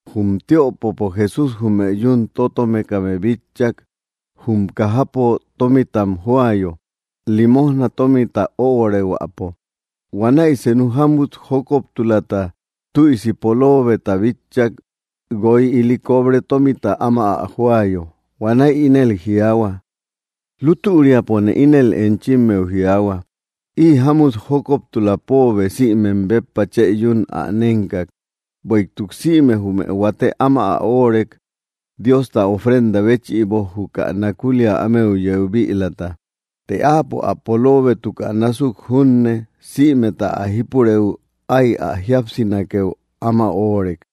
Jum tiöpopo Jesús jume yún tótomekame bitchak, jum kajapo tómitam joayo, limojna tómita öorehuäpo. Huanäi senu jámut jókoptulata tüisi poloobeta bitchak, guoy ili cobre tómita áma ä joayo. Huanäi ínel jiaahua: —Lútüriapone ínel enchimmeu jiaahua, ï jámut jókoptula póobe sïmem béppa chë yún ä nénkak; bueïtuk sïme jume huate áma ä óorek, Diosta ofrenda béchïbo, juka nakulia ámeu yeu bïlata. Të áapo ä poloobétukä násuk junne, sïmeta ä jípurëu ái ä jíapsinakeu áma óorek.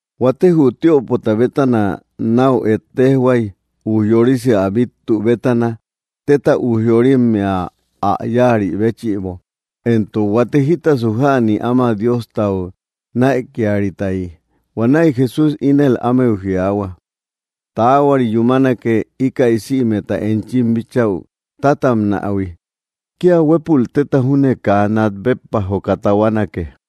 Huate jü tiöpota bétana náu ejtejhuay, ujyorisi ä bíttu bétana téta ujyoyorimmea ä yáari béchïbo, éntok huate jítasu jäni áma Diostau näikiaritayi. Huanäi Jesús ínel ámeu jiaahua: —Taahuari yúmanake íkäi sïmeta enchim bíchäu tátabnähui. Kía huépul téta júne kaa nat béppa joka tahuanake.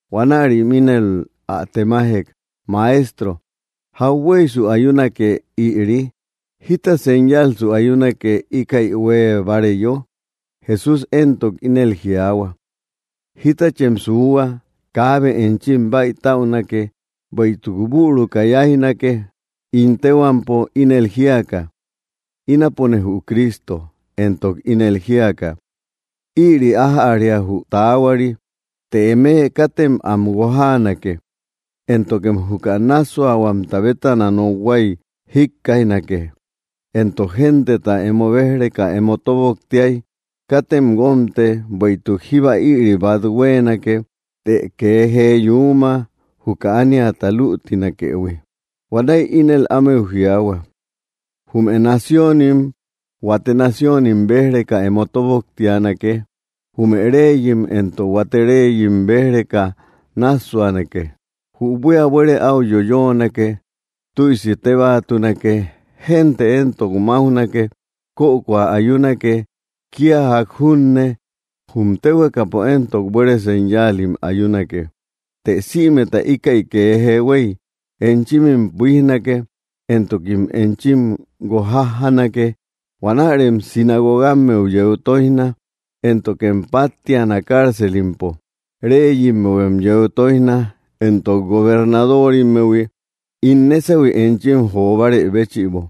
Huanärim ínel ä temajek: —Maestro, ¿jahueysu ayunake ïri? ¿Jíta señalsu ayunake íkäi huée báareyo? Jesús éntok ínel jiaahua: —Jítachem suuhua, kaabe enchim bäitäunake. Bueïtuk büruka yáijnake ín téhuampo, ínel jíaka: “Ínapone jü Cristo”, éntok ínel jíaka: “Ïri ájäria jü taahuari.” Të eme katem am guojaanake. Éntokem juka nássuahuamta bétana nokhuay jikkaijnake. Éntok genteta emo béj‑reka emo tóboktiay, katem guómte; bueïtuk jíba ïri bát huéenake; të kee jee yuuma, juka ániata luutinakëhui. Huanäi ínel ámeu jiaahua: —Jume naciónim huate naciónim béj‑reka emo tóboktianake; jume reyim éntok huate reyim béj‑reka náassuanake. Jü buía buere áu yoyoonake; tüisi tébaatunake; génte éntok máujnake. Kökoa ayunake kía ják junne; jum téhuekapo éntok buere señalim ayunake. ’Të sïmeta íkäi kee huéy, enchimim buíjnake, éntokim enchim guojajjanake. Huanärem sinagogammeu yeu tóijna, éntokem páttiana cárcelimpo. Reyimmehuem yeu tóijna, éntok gobernadorimmehui, ín nésahui enchim jo bárë béchïbo.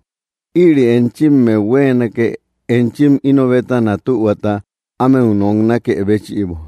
Ïri enchimmeu huéenake enchim ino bétana tühuata ámeu noknakë béchïbo.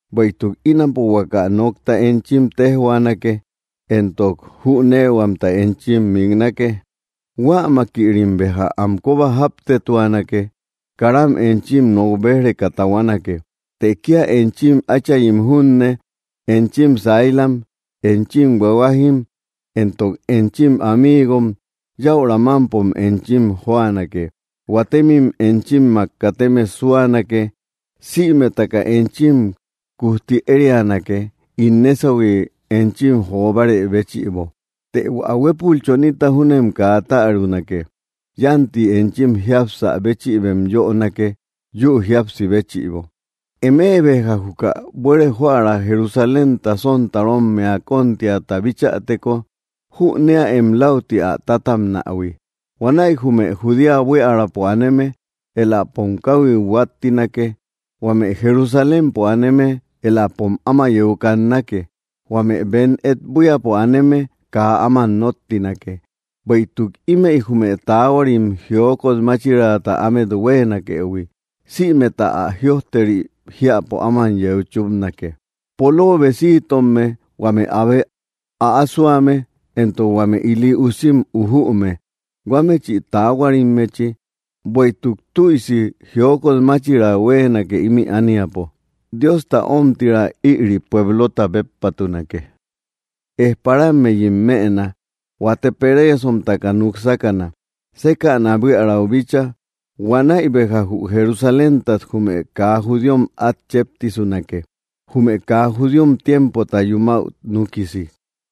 Bueïtuk ínapo huaka nokta enchim téjhuaanake, éntok jüneehuamta enchim miknake. Huämakïrim béja am kóba jáptetuanake; karam enchim nok béj‑reka tahuanake. Të kía enchim áchayim junne, enchim sailam, enchim huahuajim, éntok enchim amiigom yäura mámpo enchim jóanake. Huatemim enchimmak kateme súanake; sïmetaka enchim kujti érianake, ín nésahui enchim jo bárë béchïbo; të hua huépul chonita júnem kaa tärunake. Yánti enchim jiapsä béchïbem yönake, yü jíapsi béchïbo. ’Eme béja juka buere joära Jerusalénta sontarommea kóntiata bichäteko, jüneäem läuti ä tátabnähui. Huanäi jume Judea buiärapo aneme éläpom káhuiu huáttinake. Huame Jerusalémpo aneme éläpom áma yeu kannake; huame bem et buíapo aneme kaa áman nóttinake. Bueïtuk ímëi jume taahuarim jiokot máchiraata ámet huéenakëhui, sïmeta ä jïojteri jiäpo áman yeu chúpanake. ¡Poloobesitomme, huame abe äasoame, éntok huame ili usim ujüume huamechï taahuarimmechi! Bueïtuk tüisi jiokot máchira huéenake ímï ániapo; Diosta omtira ïri pueblota béppatunake. Ejparammeyim mëna. Huate pereesomtaka núk sákana, sékäna buiärau bíchaa. Huanäi béja jü Jerusaléntat jume kaa judíom át chéptisunake, jume kaa judíom tiempota yumäu núkisi.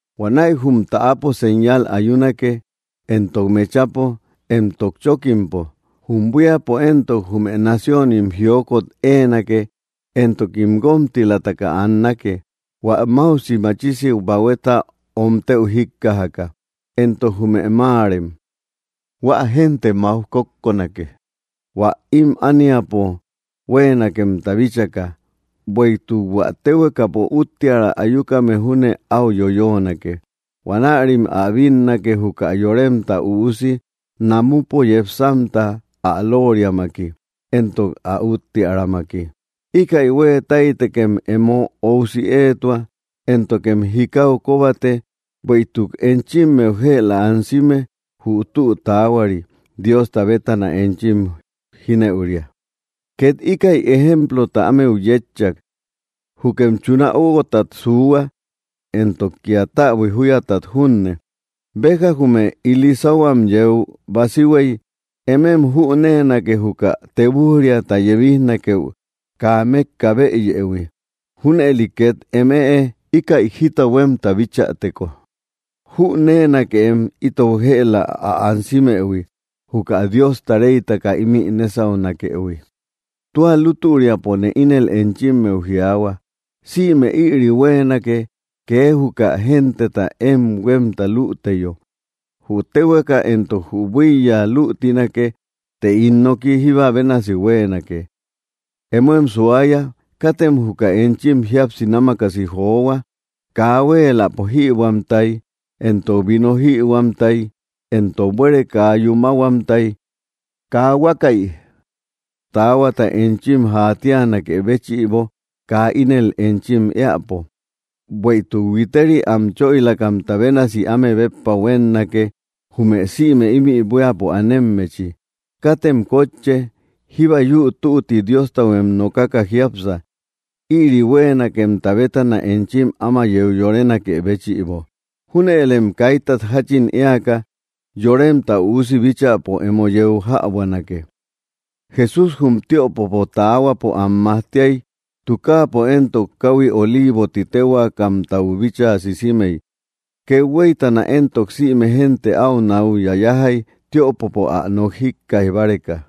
’Huanäi jum täapo señal ayunake, éntok mechapo, éntok chókimpo; jum buíapo éntok jume naciónim jiokot éenake, éntokim guómtilataka annake, hua máusi machisi bahueta omtëu jíkkajaka, éntok jume máarem. Huä génte máuj kókkonake, hua ím ániapo huéenakemta bíchaka; bueïtuk hua téhuekapo úttiära ayukame júne áu yoyoonake. Huanärim ä bínnake, juka Yoremta Üusi, namupo yepsamta ä lóoriamaki, éntok ä úttiäramaki. Íkäi huée táytekem emo óusi éetua, éntokem jikau kóbate, bueïtuk enchimmeu jëla ansime jü tü taahuari Diosta bétana enchim jínëuria. Két íkäi ejemplota ámeu yétchak: —Jukem chuna óuguotat suuhua, éntok kía täbui júyatat junne. Béja jume ili sáhuam yeu basihuey, emem jüneenake, juka tebuj‑riata yebijnakeu kaa mékka bëyëhui. Júnëli két eme, íkäi jita huémta bichäteko, jüneenakeem itou jëla ä ansimëhui, juka Diosta reytaka ímï nésaunakëhui. ’Tua lútüriapone ínel enchimmeu jiaahua, sïme ïri huéenake, kee juka genteta én huémta luuteyo. Jü téhueka éntok jü buíya luutinake, të ín noki jíba bénasi huéenake. ’Emóem suaya; katem juka enchim jíapsi námakasi johua, kaa huéeläpo jïbuähuamtay éntok vino jïhuamtay, éntok buere kaa yúmahuamtayi, kaa huakäi taahuata enchim jaatianakë béchïbo kaa ínel enchim éäpo. Bueïtuk huiteriy am choïlakamta bénasi áme béppa huénnake, jume sïme ímï buíapo anemmechi. Katem kótche. Jíba yü tutti Diostahuem nokaka jiápsa, ïri huéenakemta bétana enchim áma yeu yorenakë béchïbo. Júnëlem kaitat jáchin éaka, Yoremta Üusi bíchäpo emo yeu jäbuanake. Jesús jum tiöpopo taahuapo am majtiay; tukaapo éntok káhui Oliivo ti téhuaakamtau bíchaa sisimey. Kethueytana éntok sïme génte áu náu yayajay, tiöpopo ä nok jíkkaij báreka.